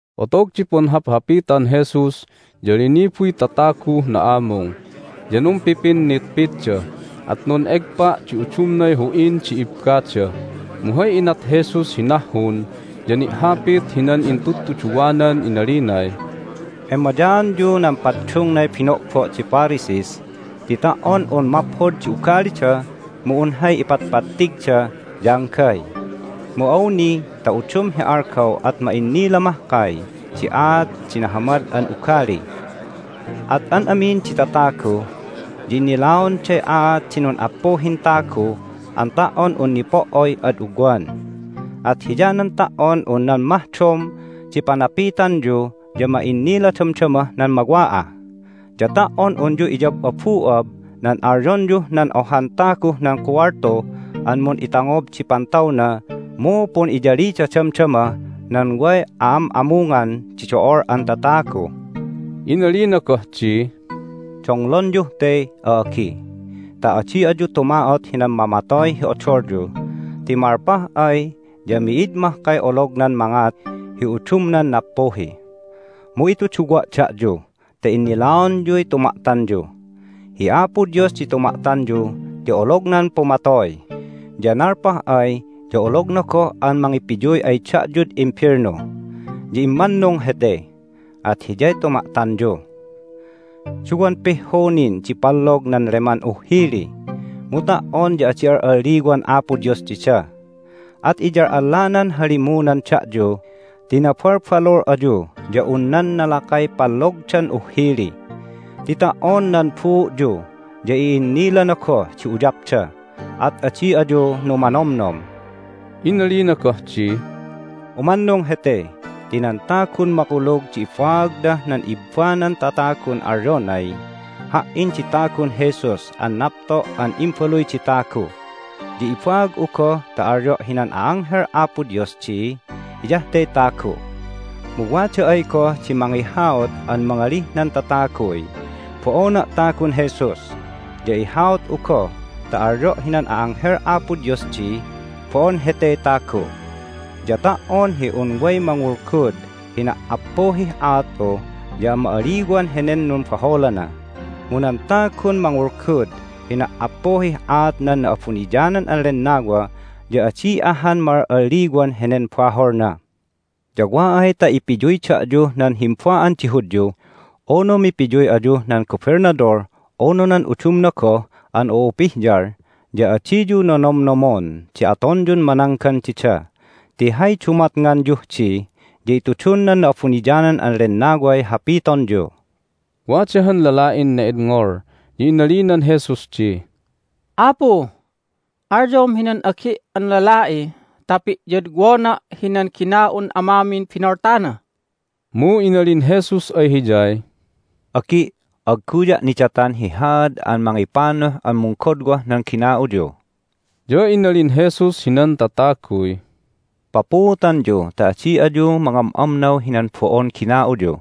Otog di punhaphapitan Jesus ya linibuy tataguh na'amung. Ya numpipinitpitda, at nun'egpa' di udumnay hu'in di ibbada. Mu hay inat Jesus hi nahhun ya ni'hapit hinan intudtuduwanan inalinay, "Emayaanyu nan paddungnay bino'bo' di Pharisees ti ta"on un maphod di ugalida mu un hay ipatpattigda ya anggay. Mu awni ta udum hi algaw at ma'innila mahkay di aat di nahamad an ugali. At an amin di tatagu ya innilaonday aat di nun'appuhin tagu an ta"on un nipo"oy ad ugwan. At hiyanan ta"on un nan mahdom di panapitanyu ya ma'innila damdamah nan mawa'ah, ya ta"on unyu iyab'abu'ab nan alyonyuh nan ohan taguh nan kuwaltu an mun'itangob di pantawna mu pun'iyalida damdamah nan way a'am'amungan di do'ol an tatagu." Inalina goh di, "Donglonyuh te, a'agi', ta adi ayu tuma'ot hinan mamatoy hi odolyu, ti malpah ay ya mi'id mahkay olognan mangat hi udumnan nappuhi. Mu ituduwa' da'yu ta innilaonyuy tuma'tanyu: hi Apo Dios di tuma'tanyu ti olognan pumatoy, ya nalpah ay ya ologna goh an mangipiyuy ay da'yud imbelnu. Ya immannung hete, at Hiyay tuma'tanyu! Duwan pihhu nin di pallog nan leman uhhili, mu ta"on ya adi al'alliwan Apo Dios dida. At iyal'allanan halimunan da'yu ti nabalbalul ayu ya un nan nalakay pallogdan uhhili! Ti ta"on nan buu'yu ya i'innilana goh di uyapda. At adi ayu numanomnom!" Inalina goh di, "Umannung hete ti nan tagun makulug di ibaagnah nan ibbanan tatagun alyonay, Ha"in di tagun Jesus an napto' an Imbaluy di Tagu! ya ibaag'u goh ta alyo' hinan a'anghel Apo Dios di, Hiyah te tagu'! Mu wada ay goh di mangihaut an mangalih nan tataguy, Bo'ona' tagun Jesus! ya ihaut'u goh ta alyo' hinan a'anghel Apo Dios di, Bo'on hete tagu'! Ya ta"on hi un way mangulgud hi na"appuhih aat'u ya ma'aliwan henen numbaholana, mu nan tagun mangulgud hi na"appuhih aat nan Na'abuniyanan an Lennawa ya adi ahan ma'al'alliwan henen baholna. Ya wa ay ta ipiyuy da'yuh nan himba'an di Hudyu, unu mipiyuy ayuh nan gobelnadol unu nan udumna goh an u'upihyal ya adiyu nonomnomon di atonyun mananggan dida ti hay dumatnganyuh di ya itudun nan Na'abuniyanan an Lennaway hapitonyu." Wada han lala'in ne'edngol, ya inalinan Jesus di, "Apu, alyom hinan agi' an lala'i ta pi'yodwona' hinan gina'un amamin binoltana!" Mu inalin Jesus ay hiyay, "Agi', agguya' nidatan hi haad an mangipanuh an munggodwah nan gina'uyu!" Ya inalin Jesus hinan tataguy, "Papuutanyu ta adi ayu mangam'amnaw hinan bo'on gina'uyu.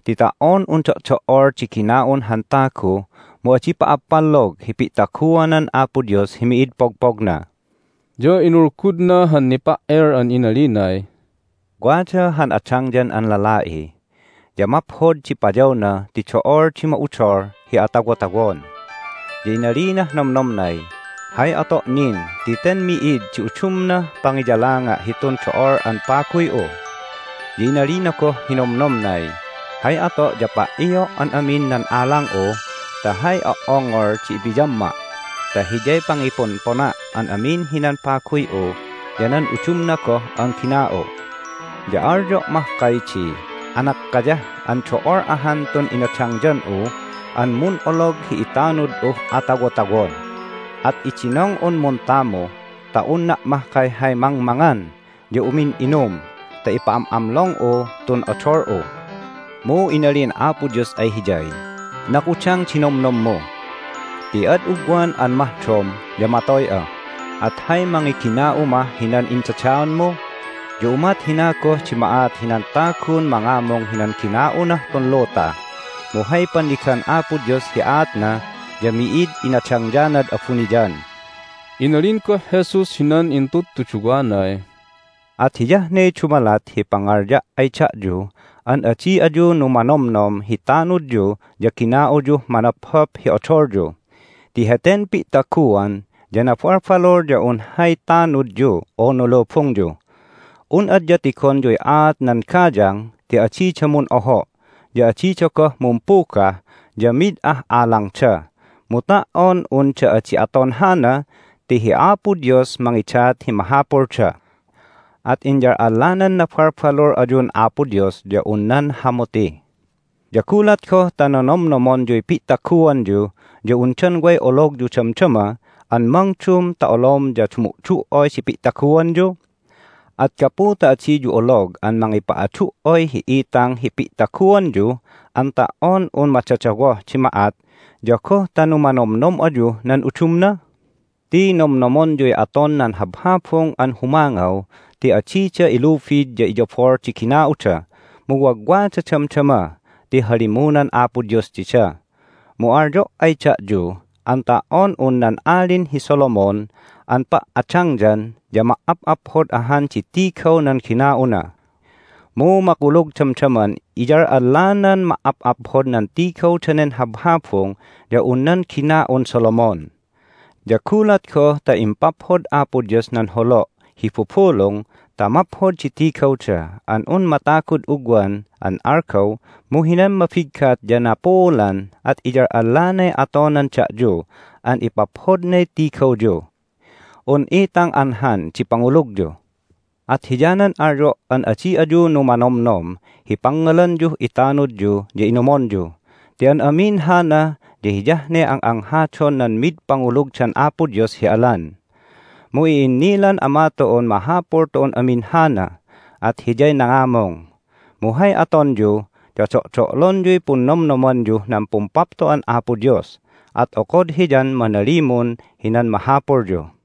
Ti ta"on un do'do"ol di gina'un han tagu mu adi pa'appallog hi pi'taguanan Apo Dios hi mid pogpogna." Ya inulgudna han nipa"el an inalinay, "Wada han adangyan an lala'i, ya maphod di payawna ti do'ol di ma'udol hi atawotawon. Ya inalinah nomnomnay, Hay ato' nin ti ten mi'id di udumnah pangiyalanga' hitun do'ol an paguy'u? Ya inalina goh hi nomnomnay, Hay ato' ya pa"io' an amin nan alang'u ta hay o"ongol di ipiyamma' ta hiyay pangiponpona' an amin hinan paguy'u ya nan udumna goh an gina'u'. Ya alyo' mahkay di, Anakkayah an do'ol ahan tun inadangyan'u an mun'olog hi itanud'uh atawotawon! At idinong'un muntamu ta unna' mahkay hay mangmangan ya umin'inum ta ipa'am'amlong'u tun odol'u! Mu inalin Apo Dios ay hiyay, Nakudang di nomnommu! Ti ad ugwan an mahdom ya matoy'a, at hay mangigina'u mah hinan indadaanmu? Ya umat hina goh di ma'at hinan tagun mangamung hinan gina'unah tun luta, mu hay pannigan Apo Dios hi aatna ya mi'id inadangyanad abuniyan." Inalin goh Jesus hinan intudtuduwanay, "At hiyah ne dumalat hi pangalya' ay da'yu an adi ayu numanomnom hi tanudyu ya gina'uyuh manophop hi odolyu ti heten pi'taguan ya nabalbalul ya un hay tanudyu unu lubungyu. Un adya tigonyuy aat nan gayang ti adida mun'oho', ya adida goh mumpugah, ya mid ah alangda, mu ta"on unda adi aton hana ti hi Apo Dios mangidat hi mahapulda! At inyal'allanan nabalbalul ayun Apo Dios ya un nan hamuti! Ya gulat goh ta nonomnomonyuy pi'taguanyu ya undan way ologyu damdama an mangdum ta olom ya dumu'du"oy di pi'taguanyu? At gapu ta adiyu olog an mangipa'adu"oy hi itang hi pi'taguanyu an ta"on un madadawoh di ma'at ya goh ta numanomnom ayuh nan udumna? Ti nomnomonyuy aton nan habhabung an humangaw ti adida ilubid ya iyabol di gina'uda, mu wagwada damdama ti halimunan Apo Dios dida. Mu alyo' ay da'yu an ta"on un nan Alin hi Solomon an pa"adangyan ya ma"ap'aphod ahan di tigaw nan gina'una. Mu makulug damdaman iyal'allanan ma"ap'aphod nan tigaw danen habhabung ya un nan gina'un Solomon! Ya gulat goh ta impaphod Apo Dios nan holo' hi bubulung ta maphod di tigawda an un matagud ugwan an algaw mu hinan mabiggat ya napuulan at iyal'allanay atonan da'yu an ipaphodnay tigawyu! Un itang anhan di pangulugyu! At hiyanan alyo' an adi ayu numanomnom hi pangngalanyuh itanudyu ya inumonyu ti an amin hana ya hiyah ne ang'anghadon nan mid pangulugdan Apo Dios hi alan. Mu i'innilan Ama tu'un mahapul tu'un amin hana, at Hiyay nangamung. Mu hay atonyu ya do'do'lonyuy punnomnomanyuh nan Pumpapto'an Apo Dios, at okod Hiyan manalimun hinan mahapulyu."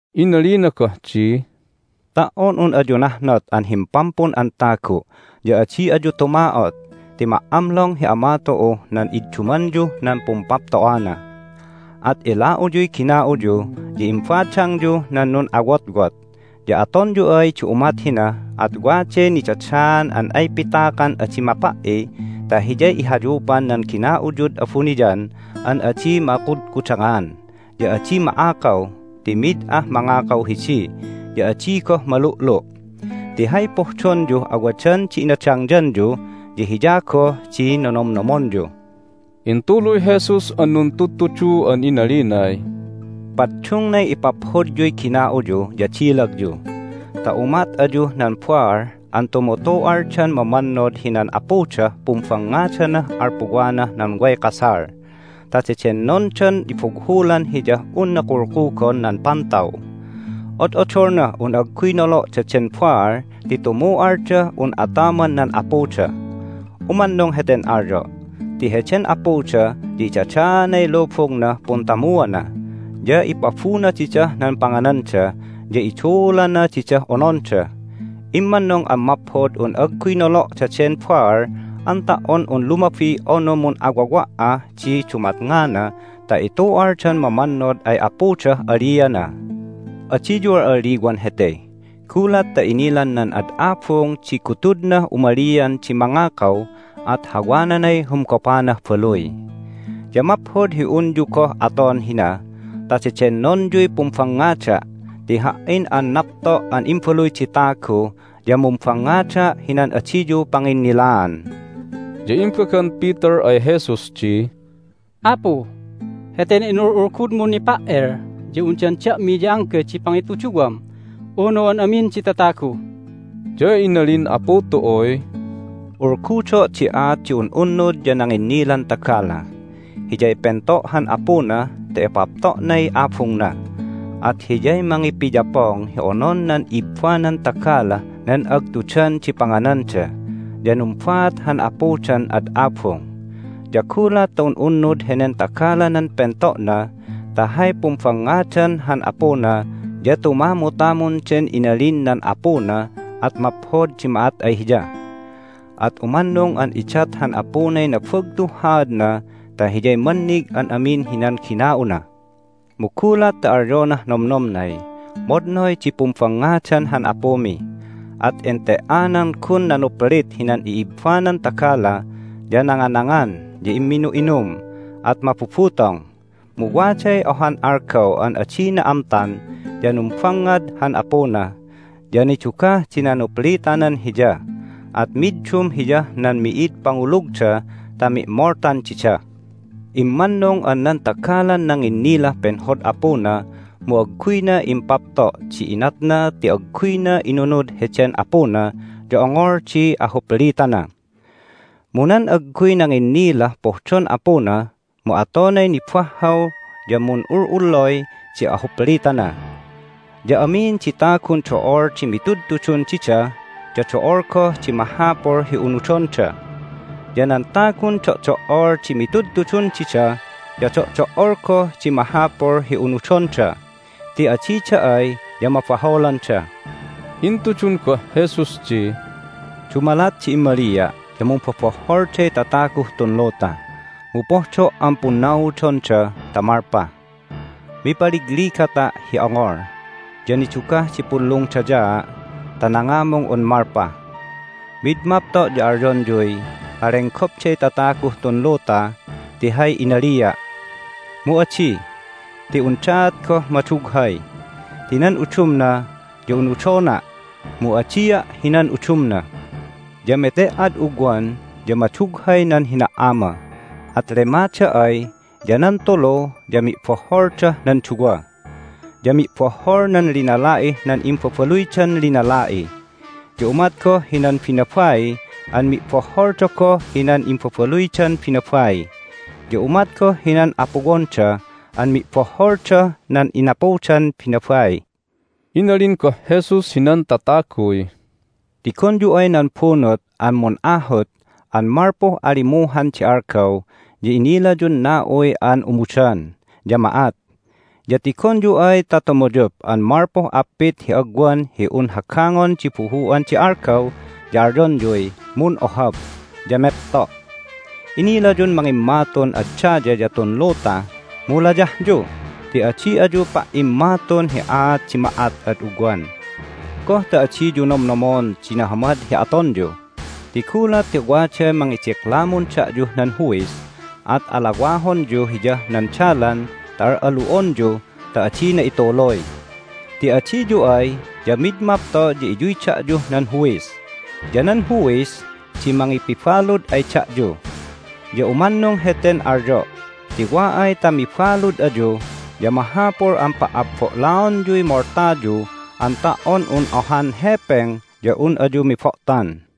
Inalina goh di, "Ta"on un ayu nahnot an Himpampun an Tagu' ya adi ayu tuma'ot ti ma"amlong hi Ama tu'uh nan iddumanyuh nan Pumpapto'ana! At ila'uyuy gina'uyu, ya imbadangyuh nan nun'awotwot. Ya atonyu ay di umat hina at waday nidadaan an ay pitakan adi mapa"i ta hiyay ihayupan nan gina'uyud abuniyan an adi makudkudangan, ya adi ma'akaw ti mid ah mangakaw hidi, ya adi goh malu'lu'. Ti hay pohdonyuh awadan di inadangyanyu ya hiya goh di nonomnomonyu!" Intuluy Jesus an nuntudtudu an inalinay, "Paddungnay ipaphodyuy gina'uyu ya dilagyu ta umat ayuh nan baal an tumutu'aldan mamannod hinan apudah pumbangngadanah alpuwanah nan way kasal. Ta dedennondan ibughulan hiyah unna kulkugon nan pantaw. Od'odolnah un agguy nolo' daden baal ti tumu'aldah un ataman nan apuda. Umannung heten alyo' ti heden apuda ya idadaanay lubungnah puntamuana, ya ipabuna didah nan pangananda, ya iduulana didah ononda. Immannung an maphod un agguy nolo' daden baal an ta"on un lumabi unu mun'awawa'ah di dumatngana ta itu'aldan mamannod ay apudah aliana! Adiyu al'aliwan hete! Gulat ta inilan nan ad abung di gutudnah umalian di mangakaw at hawananay humgopanah baluy. Ya maphod hi unyu goh aton hina ta dedennonyuy pumbangngada' ti Ha"in an napto' an Imbaluy di Tagu ya mumbangngada' hinan adiyu panginnilaan." Ya imbagan Peter ay Jesus di, "Apu, heten inul'ulgudmun nipa"el ya undan da'mi ya anggay di pangituduwam, unu an amin di tatagu?" Ya inalin Apu tu'uy, "Ulgudo' di aat di un'unnud ya nanginnilan tagala. Hiyay pento' han apuna ta ipapto'nay abungna, at hiyay mangipiyapong hi onon nan ibbanan tagalah nan agtudan di pangananda. Ya numbaat han apudan ad abung. Ya gulat ta un'unnud henen tagalanan pento'na ta hay pumbangngadan han apuna ya tumamutamun den inalin nan apuna at maphod di ma'at ay hiya! At umannung an idat han apunay nabagtuh haadna ta hiyay mannig an amin hinan gina'una. Mu gulat ta alyonah nomnomnay, Madnoy di pumbangngadan han apumi! At ente"anan gun nanuplit hinan i'ibbanan tagala, ya nanganangan, ya imminu'inum, at mabubutong. Mu waday ohan algaw an adina amtan ya numbangngad han apuna, ya nidugah di nanuplitanan hiya, at middum hiyah nan mi'id pangulugda ta mi'moltan dida. Immannung an nan tagalan nanginnilah penhod apuna mu agguyna impapto' di inatna ti agguyna inunud heden apuna ya ongol di ahuplitana. Mu nan agguy nanginnilah pohdon apuna mu atonay nibahhaw ya mun'ul'ullay di ahuplitana. Ya amin di tagun do'ol di mitudtudun dida ya do'ol goh di mahapul hi unudonda. Ya nan tagun do'do"ol di mitudtudun dida ya do'do"ol goh di mahapul hi unudonda, ti adida ay ya mabaholanda." Intudun goh Jesus di, "Dumalat di immalia' ya mumbobohholday tataguh tun luta, mu pohdo' an punnaudonda ta malpah! Mipaligligata' hi ongol, ya nidugah di punlungdayaa' ta nangamung un malpah. Mi'id mapto' ya alyonyuy malenggopday tataguh tun luta ti hay inalia'. Mu adi, ti undaat goh madughay. Ti nan udumna ya unudona', mu adia' hinan udumna. Ya mete"ad ugwan ya madughay nan hina"ama, at lemada ay ya nan tulu ya mi'bohholdah nan duwa. Ya mi'bohhol nan linala'ih nan imbabaluydan linala'i, ya umat goh hinan binabai an mi'bohholda goh hinan imbabaluydan binabai, ya umat goh hinan apuwonda an mi'bohholdah nan inapudan binabai." Inalin goh Jesus hinan tataguy, "Tigonyu ay nan bunut an mun'ahut an malpuh alimuhan di algaw ya inilayun na'uy an umudan, ya ma'at. Ya tigonyu ay ta tumuyup an malpuh appit hi agwan hi un hagangon di buhu'an di algaw ya alyonyuy, Mun'ohab! ya mepto'. Inilayun mangimmatun ad daya ya tun luta, mu layahyu ti adi ayu pa"immatun hi aat di ma'at ad ugwan! Goh ta adiyu nomnomon di nahamad hi atonyu? Ti gulat ta waday mangidiklamun da'yuh nan huwis at alawahonyu hiyah nan dalan ta al'alu'onyu ta adina ituluy. Ti adiyu ay ya mid mapto' ya iyuy da'yuh nan huwis, ya nan huwis di mangipibalud ay da'yu. Ya umannung heten alyo' ti wa ay ta mibalud ayu ya mahapul an pa'abbo'laonyuy moltayu an ta"on un ohan hepeng ya un ayu mibo'tan."